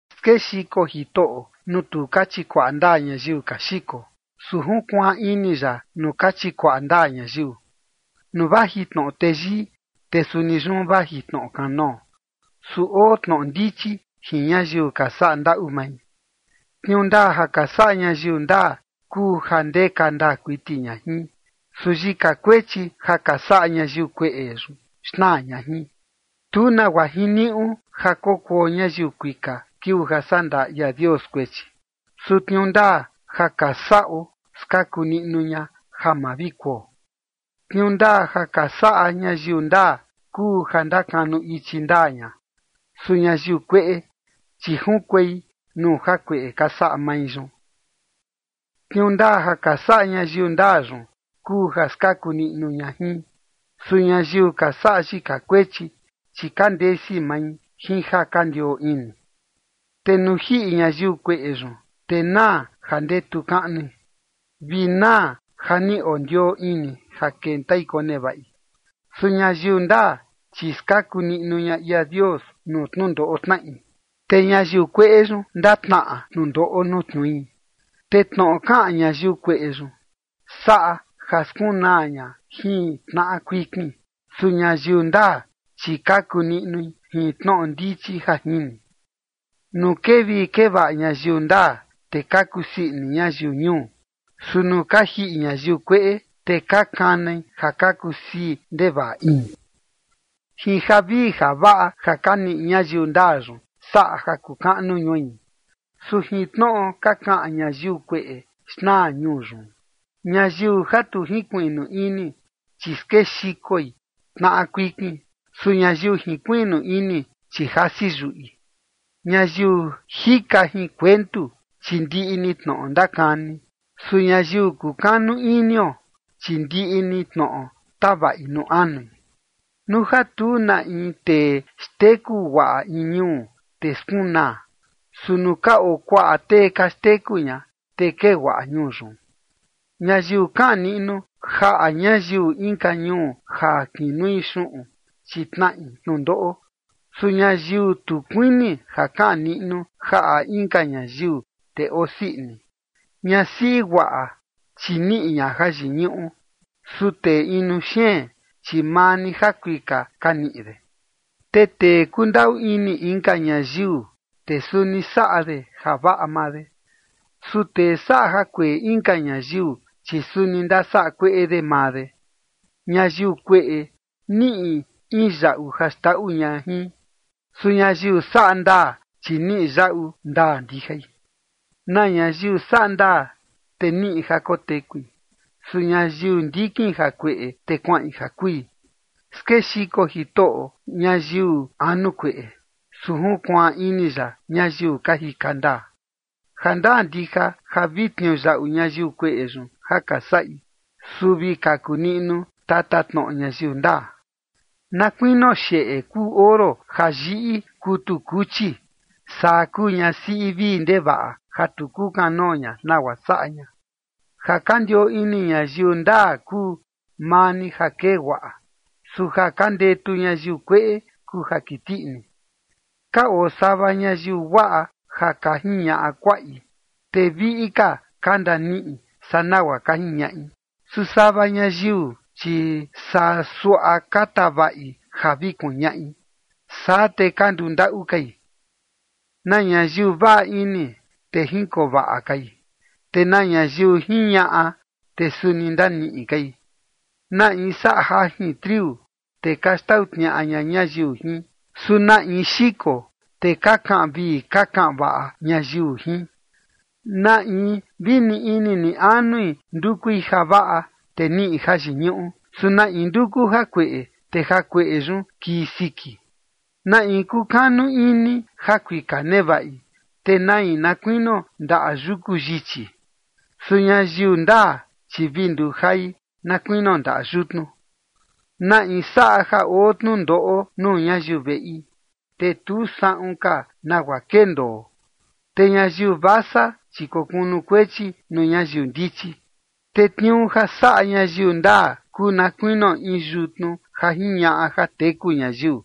Skexiko Jitoꞌo nuu tu ka chikuaꞌa ndaa ñayiu ka xiko, su junkuaan ini ya nuu ka chikuaꞌa ndaa ñayiu. Nuu vaji tnoꞌo teyii, te suni yun vaji tnoꞌo kanoo. Su oo tnoꞌo ndichi jin ñayiu ka saꞌa ndaꞌu mai. Tniuu ndaa ja ka saꞌa ñayiu ndaa kuu ja ndeka ndaa kuiti ña jin. Su yika kuechi ja ka saꞌa ñayiu kueꞌe yun xnaa ña jin. Tu nagua jiniuꞌu ja kokuo ñayiu kuika kiuu ja sandaa ia Dios kuechi. Su tniuu ndaa ja ka saꞌo skaku niꞌnu ña ja ma vi kuo. Tniuu ndaa ja ka saꞌa ñayiu ndaa kuu ja ndakanu ichi ndaa ña. Su ñayiu kueꞌe, chi junkuei nuu jakueꞌe ka saꞌa mai yun. Tniuu ndaa ja ka saꞌa ñayiu ndaa yun kuu ja skaku niꞌnu ña jin. Su ñayiu ka saꞌa yika kuechi, chi ka ndesi mai jin ja ka ndioo ini. Te nuu jiꞌi ñayiu kueꞌe yun, te naa ja ndetu kaꞌnui, vi naa ja ni ondioo ini ja kentai konevaꞌi. Su ñayiu ndaa, chi skaku niꞌnu ña ia Dios nuu tnundoꞌo tnaꞌi, te ñayiu kueꞌe yun, ndatnaꞌa tnundoꞌo nuu tniui. Te tnoꞌo kaꞌan ñayiu kueꞌe yun, saꞌa ja skunaa ña jin tnaꞌa kuikin. Su ñayiu ndaa, chi kaku niꞌnui jin tnoꞌo ndichi ja jini. Nuu kee vii kee vaꞌa ñayiu ndaa, te ka kusii ini ñayiu ñuu. Su nuu ka jiꞌi ñayiu kueꞌe, te ka kanai ja ka kusii ndevaꞌa ini. Jin javii javaꞌa ja ka niꞌi ñayiu ndaa yun saꞌa ja kuu kaꞌnu ñui. Su jin tnoꞌo ka kaꞌan ñayiu kueꞌe xnaa ñuu yun. Ñayiu ja tu jinkuiꞌnu ini, chi skexikoi tnaꞌa kuikin. Su ñayiu jinkuiꞌnu ini, chi jasi yuꞌi. Ñayiu jika jin kuentu, chi ndiꞌi ni tnoꞌo ndakani. Su ñayiu kukanu inio, chi ndiꞌi ni tnoꞌo tavaꞌi nuu anui. Nuu ja tu na in tee xteku guaꞌa in ñuu, te skunaa. Su nuu ka oo kuaꞌa tee ka xteku ña, te kee guaꞌa ñuu yun. Ñayiu kaꞌan niꞌnu jaꞌa ñayiu inka ñuu ja kinui xuꞌun, chi tnaꞌi tnundoꞌo. Su ñayiu tu kuini ja kaꞌan niꞌnu jaꞌa inka ñayiu, te osii ini. Ñasiꞌi guaꞌa, chi niꞌi ña jayiñuꞌu. Su tee inu xeen, chi maa ni jakuika ka niꞌi de. Te tee kundaꞌu ini inka ñayiu, te suni saꞌa de javaꞌa maa de. Su tee saꞌa jakueꞌe inka ñayiu, chi suni ndasaꞌa kueꞌe de maa de. Ñayiu kueꞌe niꞌi in yaꞌu ja xndaꞌu ña jin. Su ñayiu saꞌa ndaa, chi niꞌi yaꞌu ndaa ndijai. Na ñayiu saꞌa ndaa, te niꞌi ja kotekui. Su ñayiu ndikin jakueꞌe, te kuaꞌin ja kui. Skexiko Jitoꞌo ñayiu anu kueꞌe, su junkuaan ini ya ñayiu ka jika ndaa. Jandaa ndija ja vi tniuyaꞌu ñayiu kueꞌe yun ja ka saꞌi. Su vi kaku niꞌnu tatatnoꞌo ñayiu ndaa. Na kuinio xeꞌe kuu oro ja yiꞌi kutu kuchi, saa kuu ñasiꞌi vii ndevaꞌa ja tu kukanoo ña nagua saꞌa ña. Ja ka ndioo ini ñayiu ndaa kuu maa ni ja kee guaꞌa. Su ja ka ndetu ñayiu kueꞌe kuu ja kiti ini. Ka oo sava ñayiu guaꞌa ja ka jiñaꞌa kuaꞌi, te viꞌi ka ka ndaniꞌi saa nagua ka jiñaꞌi. Su sava ñayiu, chi saa suaꞌa ka tavaꞌi ja vi kuñaꞌi, saa te ka nduu ndaꞌu kai. Na ñayiu vaꞌa ini, te jinkoo vaꞌa kai, te na ñayiu jiñaꞌa, te suni ndaniꞌi kai. Na in saꞌa jajin triu, te ka xtau tniaꞌa ña ñayiu jin. Su na in xiko, te ka kaꞌan vii ka kaꞌan vaꞌa ñayiu jin. Na in vi ni ini ni anui ndukui javaꞌa, te niꞌi jayiñuꞌu. Su na in nduku jakueꞌe, te jakueꞌe yun kii siki. Na in kukanu ini ja kuika nevaꞌi, te nai na kuinio ndaꞌa yuku yichi. Su ñayiu ndaa, chi vi nduu jai na kuinio ndaꞌa yutnu. Na in saꞌa ja oo tnundoꞌo nuu ñayiu veꞌi, te tu saꞌun ka nagua kendoo. Te ñayiu vasa, chi kokunukuechi nuu ñayiu ndichi. Te tniuu ja saꞌa ñayiu ndaa kuu na kuinio in yutnu ja jiñaꞌa ja teku ñayiu.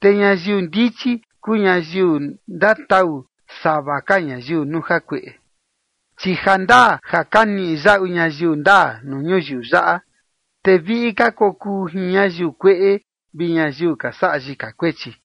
Te ñayiu ndichi kuu ñayiu ndatau sava ka ñayiu nuu jakueꞌe. Chi ja ndaa ja ka niꞌi yaꞌu ñayiu ndaa nuu ñuyiu yaꞌa, te viꞌi ka kokuu jin ñayiu kueꞌe vi ñayiu ka saꞌa yika kuechi.